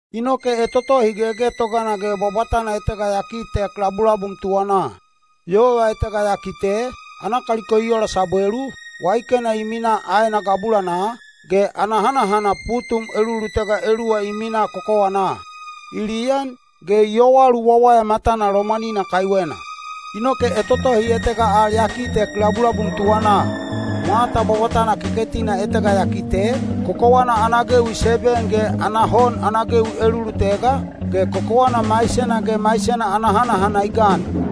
Inoke etotohi gegetogana ge bwabwatana etega ya kitek labulabum tuwanaa. Yova etega ya kite, ana kaliko i ola sabwelu, waikena i minaa aena gabulanaa, ge ana hanahana putum elulutega eluwa i minaa kokowanaa. I liyan, ge i yowalu wawaya matana lomwanina kaiwena. Inoke etotohi etega al ya kitek labulabum tuwanaa. Mwata bwabwatana keketina etega ya kite, kokowana ana gewi seben ge ana hon ana gewi elulutega, ge kokowana maisena ge maisena ana hanahana i gan.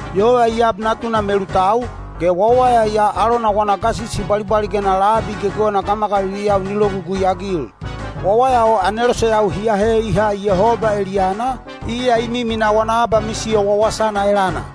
Yova i ab natuna melutau, ge wawaya ya alona wana gasisi bwalibwaligena labi gegewena gamagaliliyau ni logugui-agil. Wawaya o aneloseyau hi ahe i ha Yehoba eliyana, iya i miminaa wana abamisiyo wawasana elana.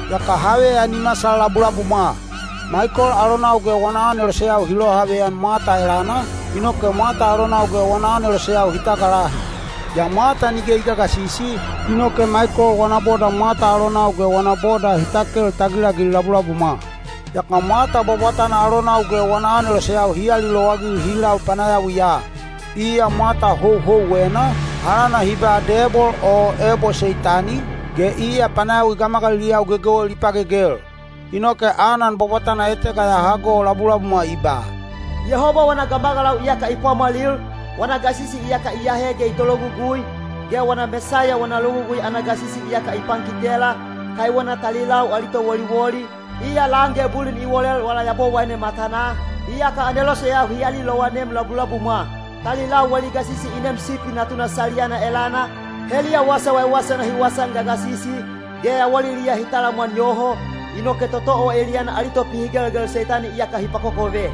Yaka haveyan i masal labulabumwa. Maikol alonau ge wana aneloseyau hi lohaveyan mwata elana, inoke mwata alonau ge wana aneloseyau hi tagalahi. Yaa mwata nige i gagasisi, inoke Maikol wana boda mwata alonau ge wana boda hi takel tagilagil labulabumwa. Yaka mwata bwabwatana alonau ge wana aneloseyau hi alilowagil hi lau panayawiya. Iya mwata houhouwena, alana hi ba Debol o ebo Seitani, ge iya panayawi gamagaliliyau gegewel i pagegel. Inoke anan bwabwatana etega ya hago labulabumwa i ba: “Yehoba wana gamagalau iyaka i pwamwalil, wana gasisi iyaka i ahe ge i tologugui, ge wana Mesaiya wana logugui ana gasisi iyaka i pankitela, kaiwena talilau ali towoliwoli, iya lan ge bulin i wolel wala Yabowaine matanaa, iyaka aneloseyau hi alilowanem labulabumwa. Talilau wali gasisi i neem Sipi Natuna saliyana elana, heliya wasa waiwaisana hi wasaan gagasisi, ge yawaliliya hi talamwan yoho, inoke toto o eliyana ali topihigelgel Seitani iyaka hi pakokove.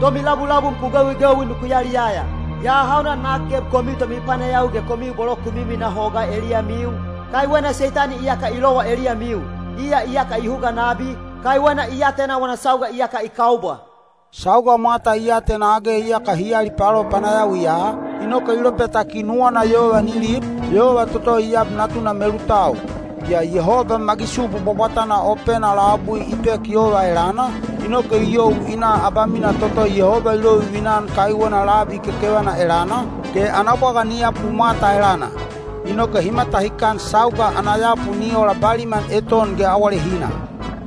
Tomilabulabum ku gewigewi nuku yaliyaya! Yaa hauna nak geb komiu tomipanayawi ge komiu bolo ku miminaa hogaa eliyamiu, kaiwena Seitani iyaka i lowa eliyamiu! Iya iyaka i huga nabi, kaiwena i atena wana sauga iyaka i kaubwa.” Sauga mwata i atena age iyaka hi alipalo panayawiya, inoke i lopetaki nuwana yova ni lib, yova toto i ab natuna melutau. Yaa Yehoba magisubu bwabwatana opena labui i pek yova elana, inoke i you i na abamina toto Yehoba i lovivina-an kaiwena labi kekevana elana, ge ana bwaga ni yapu mwata elana. Inoke hi matahikan sauga ana yapu ni ola baliman eton ge awalehina.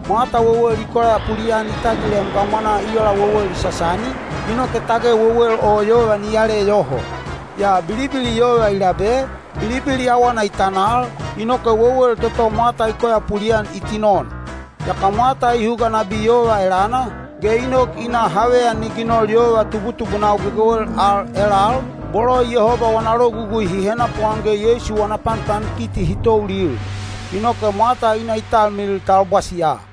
Mwata wewel i koyapuli-an i tagilem gamwanaa i ola wewel i sasani, inoke tage wewel o yova ni yale yoho. Yaa bilibili yova i labe, bilibili awana i tanal, inoke wewel toto mwata i koyapuli-an i tinon. Yaka mwata i huga nabi yova elana, ge i nok i na haveyan ni ginol yova tubutubunau gegewel al elal, bolo Yehoba wana logugui hi henapuan ge Yeisu wana panpankiti hi toulil. Inoke mwata i na i talmilil talbwasiya.